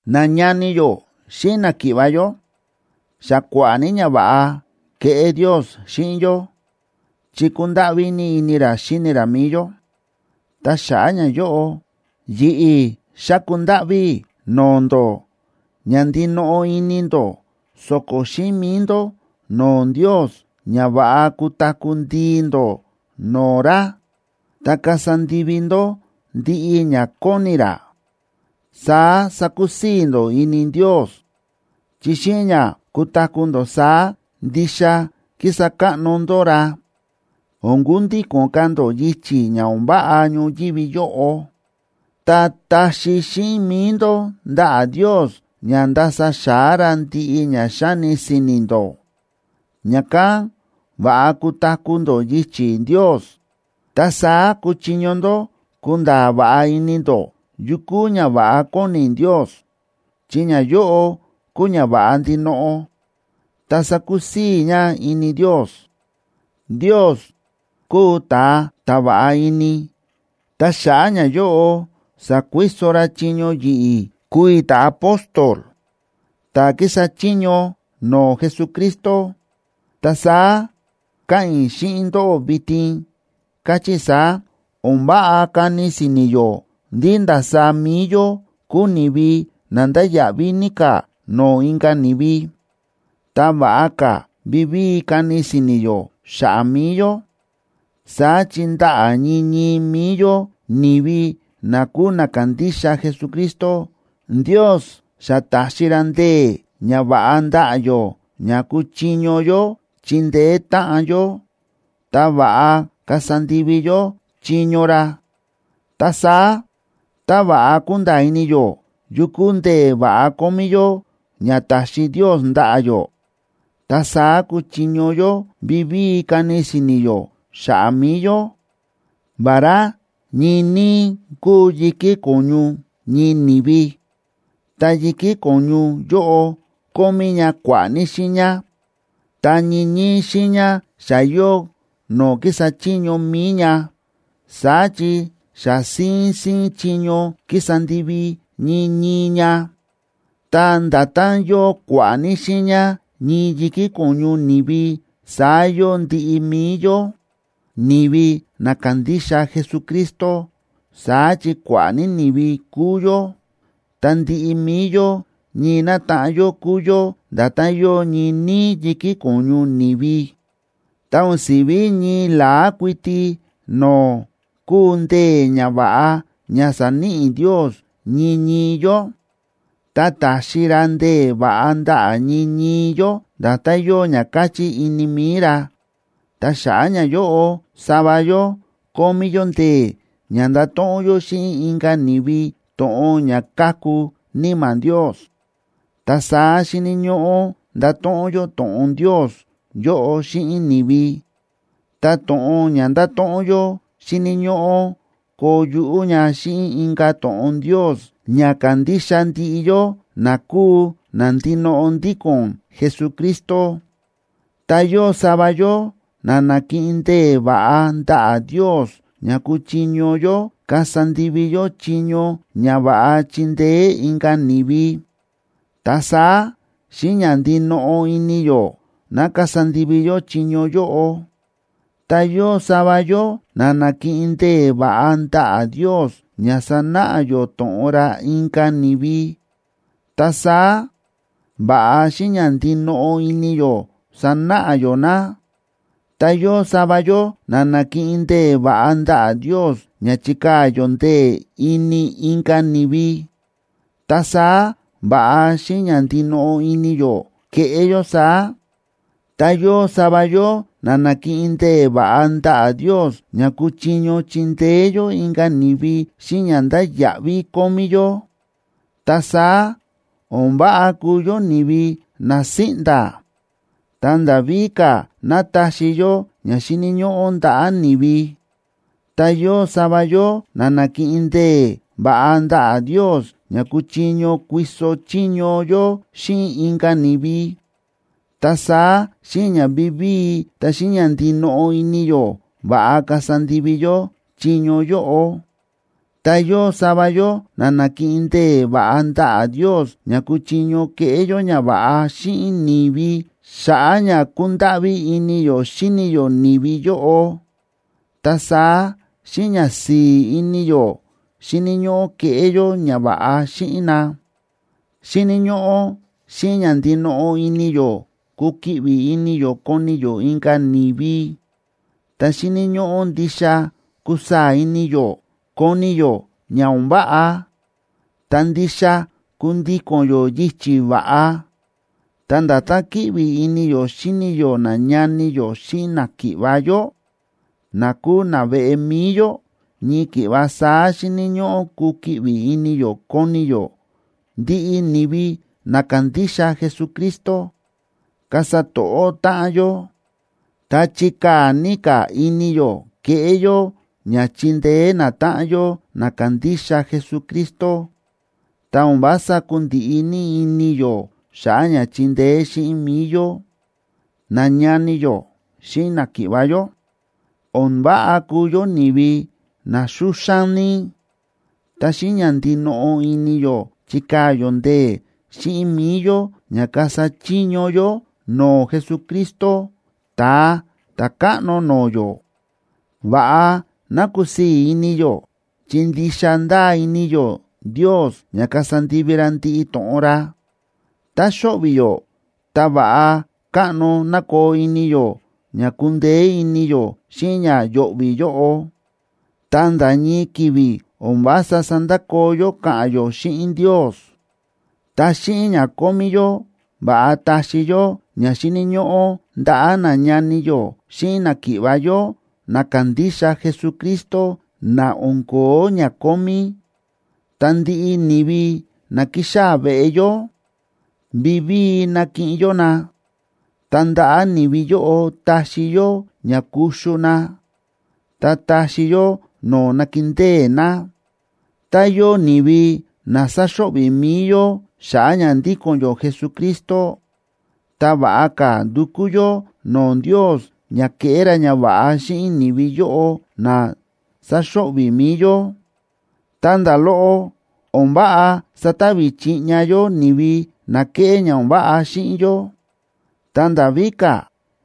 Nañani yó xíꞌin náki̱ꞌva̱ yó, xa kua̱ꞌa̱ ní ñava̱ꞌa ke̱ꞌé Ndios xíꞌin yó chi kúndáꞌví ní ini ra xíni ra mi̱i yó. Ta xa̱ꞌa̱ ñayóꞌo, yi̱ꞌi̱ xáku ndáꞌví i̱ no̱o̱ ndó ña ndinoꞌo ini ndó so̱ko̱ xíꞌin mi̱i ndó no̱o̱ Ndios ña va̱ꞌa kutaku̱ ndii ndó no̱o̱ ra, ta kasa ndivi ndó ndiꞌi ña kóni ra. Saá sakusii̱ ndó ini Ndios, chi xíꞌin ña kutaku̱ ndó saá ndixa kísa káꞌno ndó ra. O̱n kundíko̱n ka̱ ndó yichi̱ ña o̱n váꞌa ñoyívi yóꞌo, ta taxi xíꞌin mi̱i ndó ndaꞌa̱ Ndios ña ndasa xa̱á ra ndiꞌi ña xáni si̱ni̱ ndó, ña̱kán va̱ꞌa kutaku̱ ndó yichi̱ Ndios. Ta saá kuchiño ndó kunda̱a̱ va̱ꞌa ini ndó yu kúu ñava̱ꞌa kóni Ndios, chi ñayóꞌo kúu ñava̱ꞌa ndinoꞌo, ta sákusii̱ ña ini Ndios. Ndios kúu ta̱a ta̱ va̱ꞌa ini, ta xa̱ꞌa̱ ñayóꞌo sa̱kuiso ra chiño yi̱ꞌi̱ kúu i̱ ta̱apóstol ta̱ kísa chiño no̱o̱ Jesucristo. Ta saá káꞌa̱n i̱ xíꞌin ndóꞌó vitin, káchí i̱ saá: O̱n váꞌa kani si̱ni̱ yó ndí ndasaá mi̱i yó kúu ni̱vi na ndáya̱ꞌví ní ka̱ no̱o̱ inka̱ ni̱vi, ta va̱ꞌa ka̱ vivíi kani si̱ni̱ yó xa̱ꞌa̱ mi̱i yó. Saá chi ndaꞌa̱ ñii ñii mi̱i yó, ni̱vi na kúu na kándixa Jesucristo, Ndios xa ta̱xi ra ndee̱ ña va̱ꞌa ndaꞌa̱ yó ña kuchiño yó chindeé táꞌan yó, ta va̱ꞌa kasa ndivi yó chiño ra. Ta saá tá va̱ꞌa kúnda̱a̱ ini yó yu kúu ndee̱ va̱ꞌa kómí yó ña ta̱xi Ndios ndaꞌa̱ yó, ta saá kúchiño yó vivíi kani si̱ni̱ yó xa̱ꞌa̱ mi̱i yó. Vará ñii níí kúu yi̱kí ko̱ñu ñii ni̱vi, ta yi̱kí ko̱ñu yóꞌo kómí ña kua̱ꞌa̱ ní xiiña, ta ñii ñii xiiña xa yóo no̱o̱ kísa chiño mi̱i ña. Saá chi xa síín síín chiño kísa ndivi ñii ñii ña. Ta nda̱tán yóo kua̱ꞌa̱ ní xiiña ñii yi̱kí ko̱ñu ni̱vi saá yóo ndiꞌi mi̱i yó, ni̱vi na kándixa Jesucristo. Saá chi kua̱ꞌa̱ ní ni̱vi kúu yó, ta ndiꞌi mi̱i yó ñii nátaꞌan yó kúu yó nda̱tán yóo ñii níí yi̱kí ko̱ñu ni̱vi. Ta o̱n si̱ví ñii la̱á kuiti no̱o̱ kúu ndee̱ ña va̱ꞌa ña sa̱níꞌi Ndios ñii ñii yó, ta táxi ra ndee̱ va̱ꞌa ndaꞌa̱ ñii ñii yó, nda̱tán yóo ña káchí ini mi̱i ra. Ta xa̱ꞌa̱ ñayóꞌo sava yó kómí yó ndee̱ ña ndato̱ꞌon yó xíꞌin inka̱ ni̱vi to̱ꞌon ña káku Níma̱ Ndios, ta saá xíni̱ ñóꞌó ndato̱ꞌon yó to̱ꞌon Ndios yóꞌo xíꞌin ni̱vi. Ta to̱ꞌon ña ndáto̱ꞌon yó xíni̱ ñóꞌó koo yuꞌú ña xíꞌin inka̱ to̱ꞌon Ndios ña kándixa ndiꞌi yó na kúu na ndinoꞌo ndíko̱n Jesucristo. Ta yóo sava yó na na̱kiꞌin ndee̱ va̱ꞌa ndaꞌa̱ Ndios ña kuchiño yó kasa ndivi yó chiño ña va̱ꞌa chindeé inka̱ ni̱vi, ta saá xíꞌin ña ndinoꞌo ini yó ná kasa ndivi yó chiño yóꞌo. Ta yóo sava yó na na̱kiꞌin ndee̱ va̱ꞌa ndaꞌa̱ Ndios ña sanáꞌa yó to̱ꞌon ra inka̱ ni̱vi, ta saá va̱ꞌa xíꞌin ña ndinoꞌo ini yó sanáꞌa yó na. Ta yóo sava yó na na̱kiꞌin ndee̱ va̱ꞌa ndaꞌa̱ Ndios ña chikaa̱ yó ndee̱ ini inka̱ ni̱vi, ta saá va̱ꞌa xíꞌin ña ndinoꞌo ini yó keꞌé yó saá. Ta yóo sava yó na na̱kiꞌin ndee̱ va̱ꞌa ndaꞌa̱ Ndios ña kuchiño chindeé yó inka̱ ni̱vi xíꞌin ña ndáya̱ꞌví kómí yó, ta saá o̱n váꞌa kuu yó ni̱vi na síꞌnda̱, ta nda̱ víka̱ ná taxi yó ña xíni̱ ñóꞌó ndaꞌa̱ ni̱vi. Ta yóo sava yó na na̱kiꞌin ndee̱ va̱ꞌa ndaꞌa̱ Ndios ña kuchiño kuiso chiño yó xíꞌin inka̱ ni̱vi, ta saá xíꞌin ña vivíi ta xíꞌin ña ndinoꞌo ini yó va̱ꞌa kasa ndivi yó chiño yóꞌo. Ta yóo sava yó na na̱kiꞌin ndee̱ va̱ꞌa ndaꞌa̱ Ndios ña kuchiño keꞌé yó ñava̱ꞌa xíꞌin ni̱vi xa̱ꞌa̱ ña kúndáꞌví ini yó xíni yó ni̱vi yóꞌo, ta saá xíꞌin ñasi̱i̱ ini yó xíni̱ ñóꞌó keꞌé yó ñava̱ꞌa xíꞌin na. Xíni̱ ñóꞌó xíꞌin ña ndinoꞌo ini yó kukiꞌvi ini yó koni yó inka̱ ni̱vi. Ta xíni̱ ñóꞌó ndixa kusaa̱ ini yó koni yó ña o̱n váꞌa, ta ndixa kundíko̱n yó yichi̱ va̱ꞌa. Ta nda̱tán kíꞌvi ini yó xíni yó nañani yó xíꞌin náki̱ꞌva̱ yó, na kúu naveꞌe mi̱i yó, ñii ki̱ꞌva saá xíni̱ ñóꞌó kukiꞌvi ini yó koni yó ndiꞌi ni̱vi na kándixa Jesucristo. Kasa to̱ꞌó táꞌan yó, ta chikaa̱ ní ka̱ ini yó keꞌé yó ña chindeé natáꞌan yó na kándixa Jesucristo, ta o̱n vása kundiꞌi ní ini yó xa̱ꞌa̱ ña chindeé xíꞌin mi̱i yó. Nañani yó xíꞌin náki̱ꞌva̱ yó, o̱n váꞌa kuu yó ni̱vi na xúxán ní, ta xíꞌin ña ndinoꞌo ini yó chikaa̱ yó ndee̱ xíꞌin mi̱i yó ña kasa chiño yó no̱o̱ Jesucristo, Ta̱a Ta̱káꞌno no̱o̱ yó. Va̱ꞌa ná kusii̱ ini yó chi ndixa ndáa ini yó Ndios ña kasa ndivi ra ndiꞌi to̱ꞌon ra. Tá xo̱ꞌvi̱ yó, ta va̱ꞌa káꞌno ná koo ini yó ña kundeé ini yó xíꞌin ña yo̱ꞌvi̱ yóꞌo, ta nda̱ ñii ki̱vi̱ o̱n vása sandakoo yó káꞌa̱n yó xíꞌin Ndios. Ta xíꞌin ña kómí yó, va̱ꞌa taxi yó ña xíni̱ ñóꞌó ndaꞌa̱ nañani yó xíꞌin náki̱ꞌva̱ yó na kándixa Jesucristo na o̱n ko̱ó ña kómí. Ta ndiꞌi ni̱vi na kixaa̱ veꞌe yó, vivíi nakiꞌin yó na, ta ndaꞌa̱ ni̱vi yóꞌo taxi yó ña kuxu na, ta taxi yó no̱o̱ nakindée na. Tá yóo ni̱vi na saxo̱ꞌvi̱ mi̱i yó xa̱ꞌa̱ ña ndíko̱n yó Jesucristo, ta va̱ꞌa ka̱ ndukú yó no̱o̱ Ndios ña keꞌé ra ñava̱ꞌa xíꞌin ni̱vi yóꞌo na sáxo̱ꞌvi̱ mi̱i yó. Ta nda̱ loꞌo, o̱n váꞌa satavi chiꞌña yó ni̱vi na kéꞌé ña o̱n váꞌa xíꞌin yó. Ta nda̱ víka̱,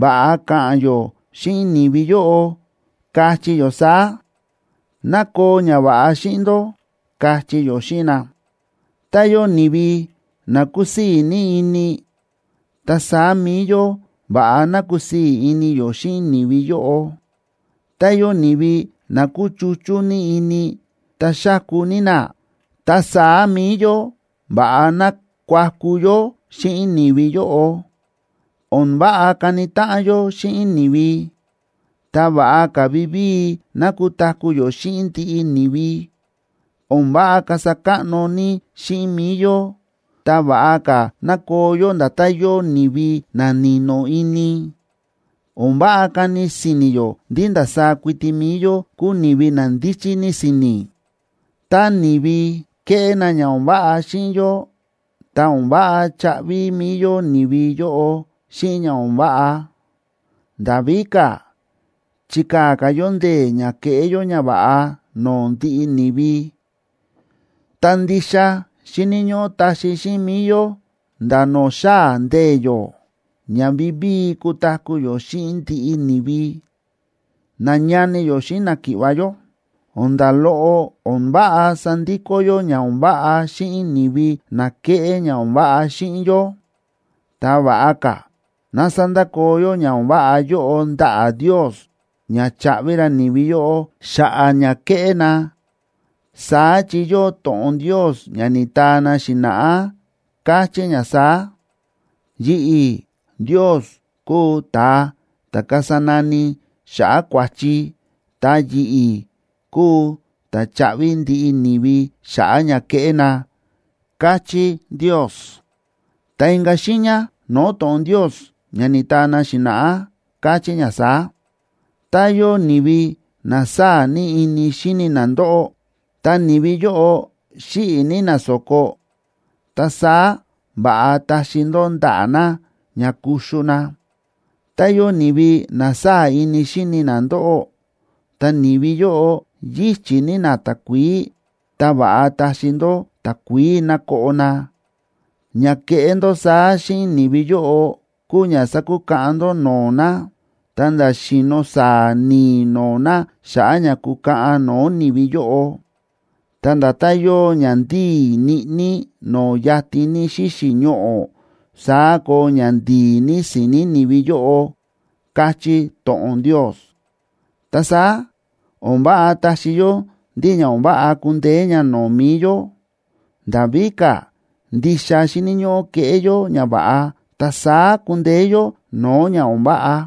va̱ꞌa ka̱ꞌa̱n yó xíꞌin ni̱vi yóꞌo, kachí yó saá: “Ná koo ñava̱ꞌa xíꞌin ndó”, kachí yó xíꞌin na. Tá yóo ni̱vi na kúsii̱ ní ini, ta saá mi̱i yó va̱ꞌa ná kusii̱ ini yó xíꞌin ni̱vi yóꞌo. Tá yóo ni̱vi na kúchuchú ní ini ta xáku ní na, ta saá mi̱i yó va̱ꞌa ná kuaku yó xíꞌin ni̱vi yóꞌo. O̱n váꞌa kani táꞌan yó xíꞌin ni̱vi, ta va̱ꞌa ka̱ vivíi ná kutaku̱ yó xíꞌin ndiꞌi ni̱vi. O̱n váꞌa kasa káꞌno ní xíꞌin mi̱i yó, ta va̱ꞌa ka̱ ná koo yó nda̱tán yóo ni̱vi na ni̱no̱ ini. O̱n váꞌa kani si̱ni̱ yó ndí ndasaá kuiti mi̱i yó kúu ni̱vi na ndíchí ní si̱ni̱. Tá ni̱vi keꞌé na ña o̱n váꞌa xíꞌin yó, ta o̱n váꞌa chaꞌvi mi̱i yó ni̱vi yóꞌo xíꞌin ña o̱n váꞌa. Nda̱ víka̱, chikaa̱ ka̱ yó ndee̱ ña keꞌé yó ñava̱ꞌa no̱o̱ ndiꞌi ni̱vi. Ta ndixa xíni̱ ñóꞌó taxi xíꞌin mi̱i yó nda̱ no̱o̱ xaa̱ ndee̱ yó, ña vivíi kutaku̱ yó xíꞌin ndiꞌi ni̱vi. Nañani yó xíꞌin náki̱ꞌva̱ yó, o̱n nda̱ loꞌo o̱n váꞌa sandikó yó ña o̱n váꞌa xíꞌin ni̱vi na kéꞌé ña o̱n váꞌa xíꞌin yó. Ta va̱ꞌa ka̱ ná sandakoo yó ña o̱n váꞌa yóꞌo ndaꞌa̱ Ndios ña chaꞌvi ra ni̱vi yóꞌo xa̱ꞌa̱ ña ke̱ꞌé na. Saá chi yóo to̱ꞌon Ndios ña ni̱taa na xi̱na̱ꞌá, káchí ña saá: “Yi̱ꞌi̱, Ndios, kúu ta̱a ta̱ kasa nani xa̱ꞌa̱ kua̱chi, ta yi̱ꞌi̱ kúu ta̱ chaꞌvi ndiꞌi ni̱vi xa̱ꞌa̱ ña ke̱ꞌé na”, káchí Ndios. Ta inka̱ xiiña no̱o̱ to̱ꞌon Ndios ña ni̱taa na xi̱na̱ꞌá, káchí ña saá: “Tá yóo ni̱vi na sáa̱ ini xíni na ndóꞌó, ta ni̱vi yóꞌo xíꞌi̱ ní na so̱ko, ta saá va̱ꞌa taxi ndó ndaꞌa̱ na ña kuxu na. Tá yóo ni̱vi na sáa̱ ní ini xíni na ndóꞌó, ta ni̱vi yóꞌo yíchi̱ ní na takuií, ta va̱ꞌa taxi ndó takuií ná koꞌo na. Ña keꞌé ndó saá xíꞌin ni̱vi yóꞌo kúu ña sakukaꞌan ndó no̱o̱ na, ta̱nda̱ xi̱no̱ sáa̱ ni̱i̱ no̱o̱ na xa̱ꞌa̱ ña kukaꞌan no̱o̱ ni̱vi yóꞌo. Ta nda̱tán yóo ña ndíi̱ ñiꞌní no̱o̱ yatin ní xíxi̱ ñoꞌo̱, saá koo ña ndi̱i̱ ní si̱ni̱ ni̱vi yóꞌo”, káchí to̱ꞌon Ndios. Ta saá o̱n váꞌa táxi yó ndí ña o̱n váꞌa kundeé ña no̱o̱ mi̱i yó. Nda̱ víka̱, ndixa xíni̱ ñóꞌó keꞌé yó ñava̱ꞌa, ta saá kundeé yó no̱o̱ ña o̱n váꞌa.